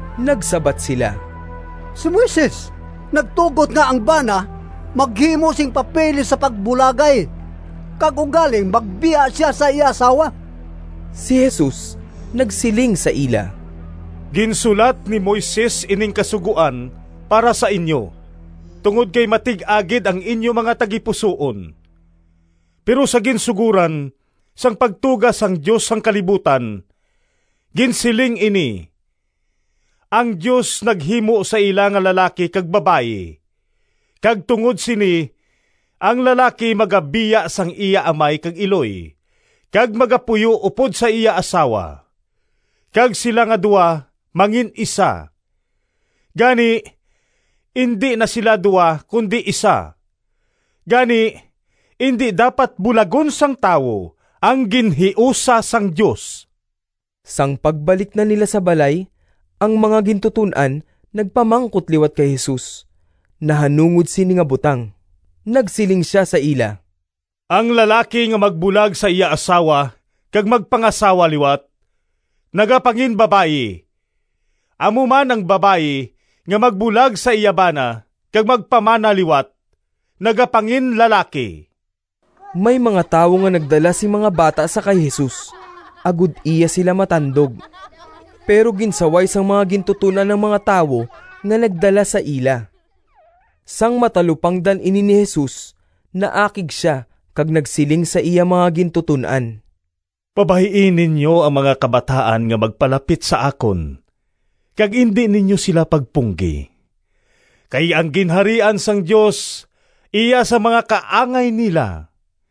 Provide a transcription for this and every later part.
Nagsabat sila, “Si Moises nagtugot nga ang bana maghimo sing papeles sa pagbulagay kag ugaling magbiya sia sa iya asawa.” Si Jesus nagsiling sa ila, “Ginsulat ni Moises ining kasugoan para sa inyo, tungod kay matig-a gid ang inyo mga tagipusoon. Pero sa ginsugoran, sang pagtuga sang Dios sang kalibutan, ginsiling ini, ‘Ang Dios naghimo sa ila nga lalaki kag babayi. Kag tungod sini, ang lalaki magabiya sang iya amay kag iloy, kag magapuyo upod sa iya asawa, kag sila nga duha mangin-isa.’ Gani, indi na sila duha, kundi isa. Gani, indi dapat bulagon sang tawo ang ginhiusa sang Dios.” Sang pagbalik na nila sa balay, ang mga gintuton-an nagpamangkot liwat kay Jesus nahanungod sini nga butang. Nagsiling sia sa ila, “Ang lalaki nga magbulag sa iya asawa kag magpangasawa liwat, nagapanginbabayi. Amo man ang babayi nga magbulag sa iya bana kag magpamana liwat nagapanginlalaki.” May mga tawo nga nagdala sing mga bata sa kay Jesus agod iya sila matandog, pero ginsaway sang mga gintuton-an ang mga tawo nga nagdala sa ila. Sang matalupangdan ini ni Jesus, naakig sia kag nagsiling sa iya mga gintuton-an, “Pabay-i ninyo ang mga kabataan nga magpalapit sa akon, kag indi ninyo sila pagpunggi, kay ang Ginharian sang Dios iya sang mga kaangay nila.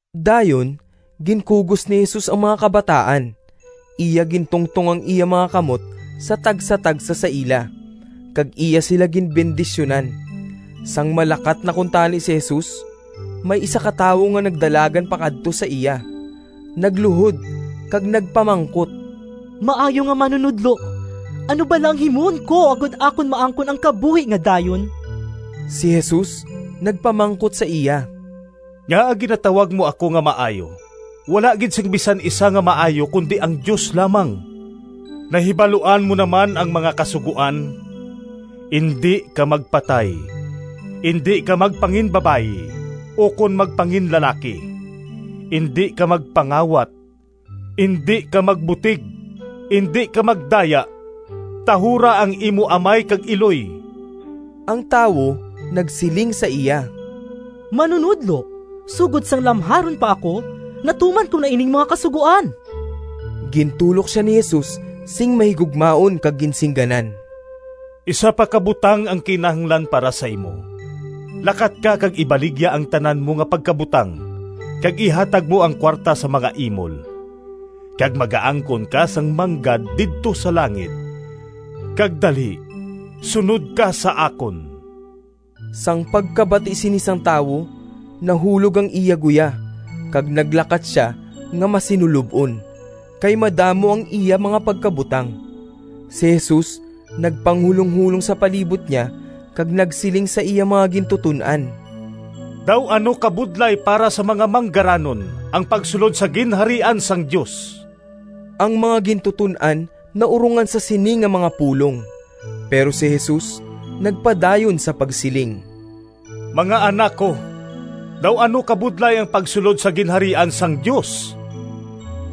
Dayon ginkugos ni Jesus ang mga kabataan, iya gintungtong ang iya mga kamot sa tagsatagsa sa ila, kag iya sila ginbendisyunan. Sang malakat na kuntani si Jesus, may isa ka tawo nga nagdalagan pakadto sa iya, nagluhod kag nagpamangkot, “Maayo nga Manunodlo, ano bala ang himuon ko agod akon maangkon ang kabuhi nga dayon?” Si Jesus nagpamangkot sa iya, “Ngaa ginatawag mo ako nga maayo? Wala gid sing bisan isa nga maayo kundi ang Dios lamang. Nahibaluan mo naman ang mga kasugoan: ‘Indi ka magpatay, indi ka magpanginbabayi ukon magpanginlalaki, indi ka magpangawat, indi ka magbutig, indi ka magdaya, tahura ang imo amay kag iloy.’” Ang tawo nagsiling sa iya, “Manunodlo, sugod sang lamharon pa ako natuman ko na ining mga kasugoan.” Gintulok sia ni Jesus sing mahigugmaon kag ginsingganan, “Isa pa ka butang ang kinahanglan para sa imo. Lakat ka kag ibaligya ang tanan mo nga pagkabutang, kag ihatag mo ang kuwarta sa mga imol, kag magaangkon ka sang manggad didto sa langit, kag dali sunod ka sa akon.” Sang pagkabati sini sang tawo, nahulog ang iya guya, kag naglakat sia nga masinulob-on, kay madamo ang iya mga pagkabutang. Si Jesus nagpanghulonghulong sa palibot niya kag nagsiling sa iya mga gintuton-an, “Daw ano kabudlay para sa mga manggaranon ang pagsulod sa Ginharian sang Dios!” Ang mga gintuton-an naurongan sa sini nga mga pulong, pero si Jesus nagpadayon sa pagsiling, “Mga anak ko, daw ano kabudlay ang pagsulod sa Ginharian sang Dios!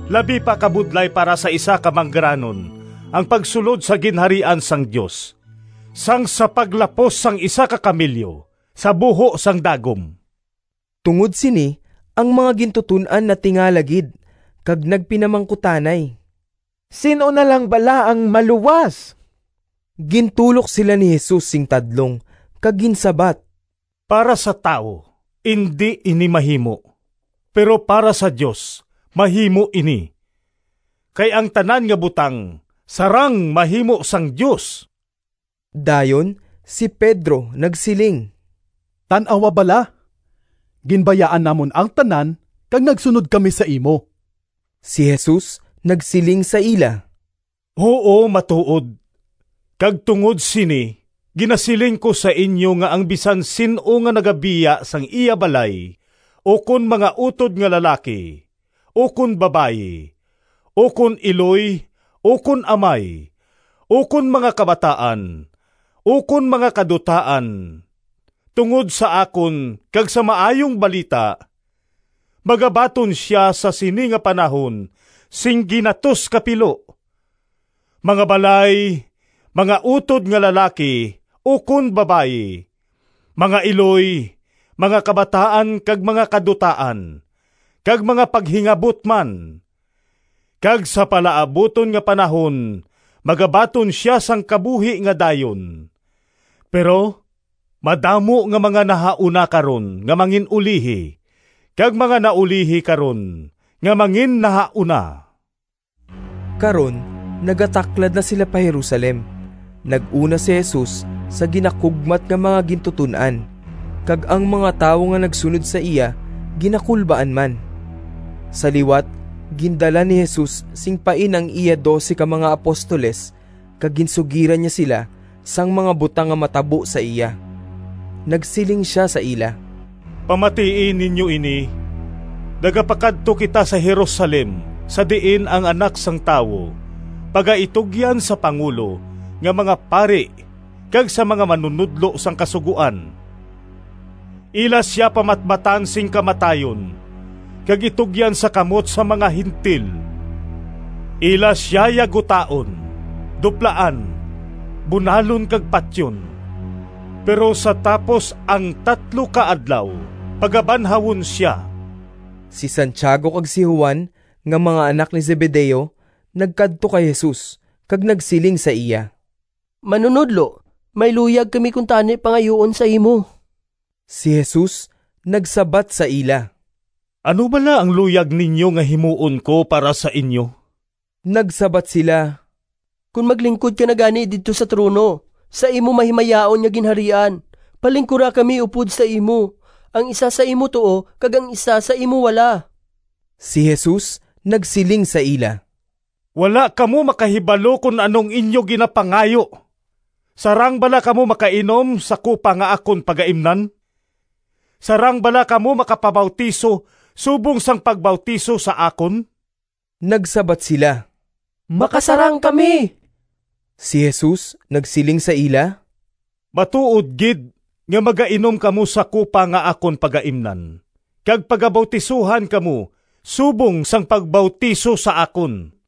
Labi pa kabudlay para sa isa ka manggaranon ang pagsulod sa Ginharian sang Dios, sang sa paglapos sang isa ka kamelyo sa buho sang dagom.” Tungod sini, ang mga gintuton-an natingala gid kag nagpinamangkutanay, “Sin-o na lang bala ang maluwas?” Gintulok sila ni Jesus sing tadlong, kag ginsabat, “Para sa tawo indi ini mahimo, pero para sa Dios mahimo ini, kay ang tanan nga butang sarang mahimo sang Dios.” Dayon si Pedro nagsiling, “Tan-awa bala, ginbayaan namon ang tanan kag nagsunod kami sa imo.” Si Jesus nagsiling sa ila, “Huo matuod, kag tungod sini ginasiling ko sa inyo nga ang bisan sin-o nga nagabiya sang iya balay, ukon mga utod nga lalaki ukon babayi, ukon iloy, ukon amay, ukon mga kabataan, ukon mga kadutaan tungod sa akon kag sa Maayong Balita, magabaton sia sa sini nga panahon sing ginatos ka pilo: mga balay, mga utod nga lalaki ukon babayi, mga iloy, mga kabataan kag mga kadutaan, kag mga paghingabot man. Kag sa palaabuton nga panahon magabaton sia sang kabuhi nga dayon. Pero madamo nga mga nahauna karon nga mangin-ulihi, kag mga naulihi karon nga manginnahauna.” Karon nagataklad na sila pa Jerusalem. Nag-una si Jesus sa ginakugmat nga mga gintuton-an, kag ang mga tawo nga nagsunod sa iya ginakulbaan man. Sa liwat gindala ni Jesus sing pain ang iya dose ka mga apostoles kag ginsugiran niya sila sang mga butang nga matabo sa iya. Nagsiling sia sa ila, “Pamatii ninyo ini, nagapakadto kita sa Jerusalem sa diin ang Anak sang Tawo pagaitugyan sa pangulo nga mga pari kag sa mga manunodlo sang Kasugoan. Ila sia pamatbatan sing kamatayon, kag itugyan sa kamot sang mga Gentil. Ila sia yagutaon, duplaan, bunalon kag patyon, pero sa tapos ang tatlo ka adlaw pagabanhawon sia.” Si Santiago kag si Juan nga mga anak ni Zebedeo, nagkadto kay Jesus, kag nagsiling sa iya, “Manunodlo, may luyag kami kuntani pangayuon sa imo.” Si Jesus nagsabat sa ila, “Ano bala ang luyag ninyo nga himuon ko para sa inyo?” Nagsabat sila, “Kon maglingkod ka na gani didto sa trono sa imo mahimayaon nga Ginharian, palingkura kami upod sa imo, ang isa sa imo tuo kag ang isa sa imo wala.” Si Jesus nagsiling sa ila, “Wala kamo makahibalo kon ano ang inyo ginapangayo! Sarang bala kamo makainom sa kupa nga akon pagaimnan? Sarang bala kamo makapabautiso subong sang pagbautiso sa akon?” Nagsabat sila, “Makasarang kami.” Si Jesus nagsiling sa ila, “Matuod gid nga magainom kamo sa kupa nga akon pagaimnan kag pagabautisohan kamo subong sang pagbautiso sa akon.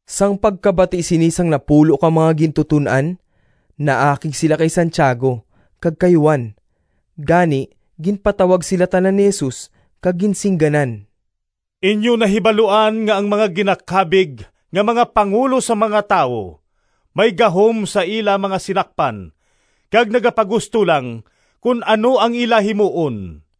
Sang pagkabati sini sang napulo ka mga gintuton-an, naakig sila kay Santiago kag kay Juan. Gani, ginpatawag sila tanan ni Jesus kag ginsingganan, “Inyo nahibaluan nga ang mga ginakabig nga mga pangulo sang mga tawo may gahom sa ila mga sinakpan kag nagapagusto lang kon ano ang ila himuon.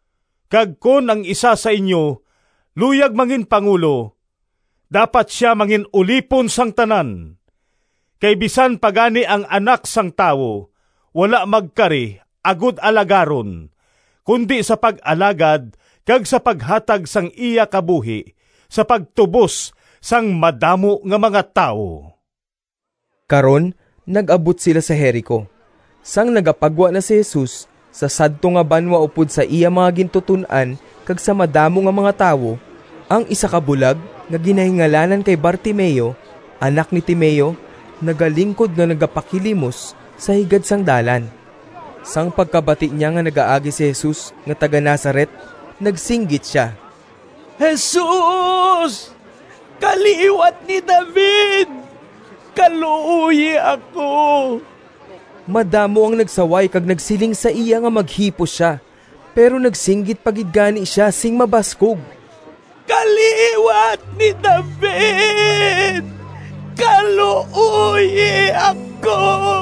Kag kon ang isa sa inyo luyag manginpangulo, dapat sia mangin-ulipon sang tanan. Kay bisan pa gani ang Anak sang Tawo wala magkari agod alagaron, kundi sa pag-alagad kag sa paghatag sang iya kabuhi sa pagtubos sang madamo nga mga tawo.” Karon nag-abot sila sa Jerico. Sang nagapagwa na si Jesus sa sadto nga banwa upod sa iya mga gintuton-an kag sa madamo nga mga tawo, ang isa ka bulag nga ginahingalanan kay Bartimeo, anak ni Timeo, nagalingkod nga nagapakilimos sa higad sang dalan. Sang pagkabati niya nga nagaagi si Jesus nga taga-Nazaret, nagsinggit sia, “Jesus, kaliwat ni David, kaluoyi ako!” Madamo ang nagsaway kag nagsiling sa iya nga maghipos sia. Pero nagsinggit pa gid gani sia sing mabaskog, “Kaliwat ni David, kaluoyi ako!”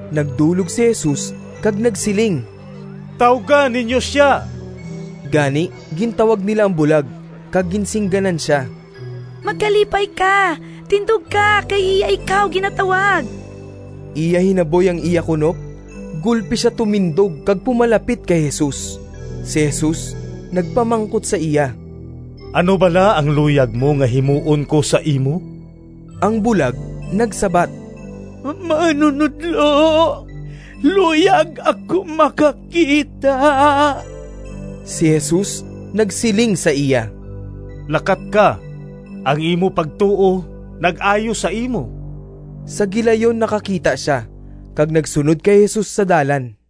Nagdulog si Jesus kag nagsiling, “Tawga ninyo sia.” Gani, gintawag nila ang bulag, kag ginsingganan sia, “Magkalipay ka, tindog ka, kay iya ikaw ginatawag.” Iya hinaboy ang iya kunop, gulpi sia tumindog kag pumalapit kay Jesus. Si Jesus nagpamangkot sa iya, “Ano bala ang luyag mo nga himuon ko sa imo?” Ang bulag nagsabat, “Manunodlo, luyag ako makakita.” Si Jesus nagsiling sa iya, “Lakat ka, ang imo pagtuo nag-ayo sa imo.” Sa gilayon nakakita sia, kag nagsunod kay Jesus sa dalan.